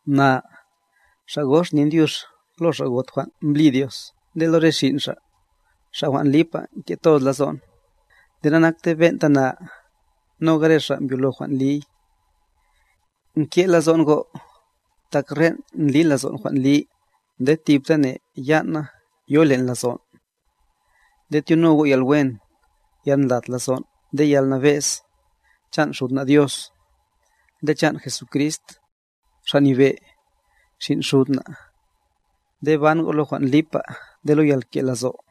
Na, xa' gox nin dyux lo xa' got jwan' mblí Diosa nde lo re xin' xa', xa' jwan' lipa nke' toz lazo'n, nde nanakte ben'ta na, noga re xa' mbyolo jwan' liy. Nke' lazo'n go', tak ren' ndli lazon' jwan li, nde thiptane yan'na yoy len' lazon'. Nde tyono go' yalwen, yalndlat lazo' nde yalnabe'z, chan' Xud na Dios, nde chan' Jesucrist, Xa' Nyebe', Xin' Xud na', nde ban go' lo jwan' lipab nde lo yalke'lazo'.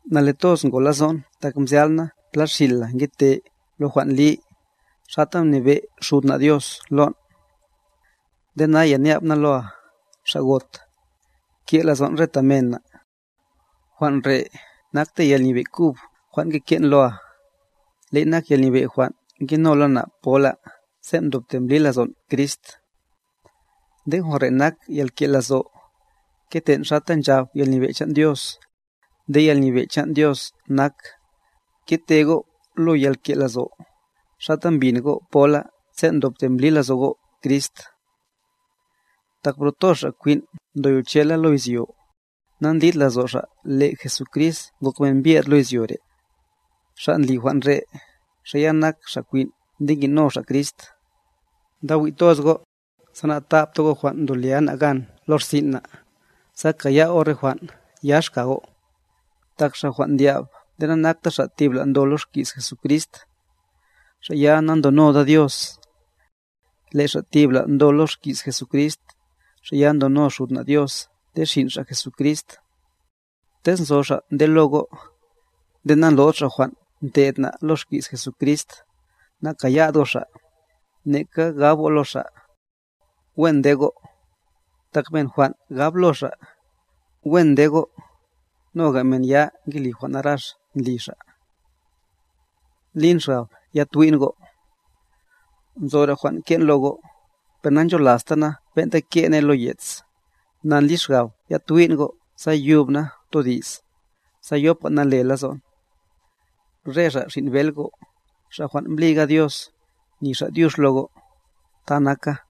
Nale toz ngo lazo'n tak mzyal' na pla xin' la ngete lo jwan' li, xata mnabe' Xud na' Dios lon'. Nde naya nya'b na loa, xa' got,c ke' lazon' re ta men na'. Jwan' re' nakte yalnyebe' kub jwan' ngeke'n loa, le'y nak yalnyebe' jwan' ngenola na' pola sen' mdobte mbli lazon' Crist. Nde jwan' re' nak yalke' lazo', keten' xata nchab yalnyebe' chan' Dios. Nde yalnyebe' chan' Dios nak, kete go' lo yalke' lazo', xata mbin go' pola sen' mdobte mbli lazo' go' Crist. Tak bro toz xa' kwin' ndoyochela lo izyo, na'ndlid lazo' xa' le' Jesucrist ngok men mbyed lo izyo re'. Xa' ndli jwan' re', xa' ya nak xa' kwin' nde ngi'no xa' Crist. Ndawi' toz go', sa na'tabta go' jwan' ndo lia na' gan lo rsin' na', sa kaya go' re jwan' yax ka go'. Tak xa' jwan' ndyab nde nanakta xa' tibla' ndo lo xki's Jesucrist, xa' ya na'ndonoda Dios. Le' xa' tibla' ndo lo xki's Jesucrist, xa' ya ndono Xud na' Dios nde Xin' Xa' Jesucrist. Tez nzo xa' nde lo go', nde na'ndlo'd xa' jwan' nte'd na' lo xki's Jesucrist, na'kayad go' xa', neka gab go' lo xa': ¡Wen nde go'! Tak men jwan' gab lo xa': ¡Wen nde go'!, noga men ya ngeli jwan' narax ndli xa'. Ndlin xgab yatwi'n go' Nzora jwan' ke'n lo go', per na'ncholasta na' ben'ta ke' ne lo ye's, na ndli xgab yatwi'n go' sa yub na' todi's, sa yopa nale lazon'. Re xa' xin' bel go', xa' jwan' mblíga Dios, ni xa' dyux lo go'. Ta naka.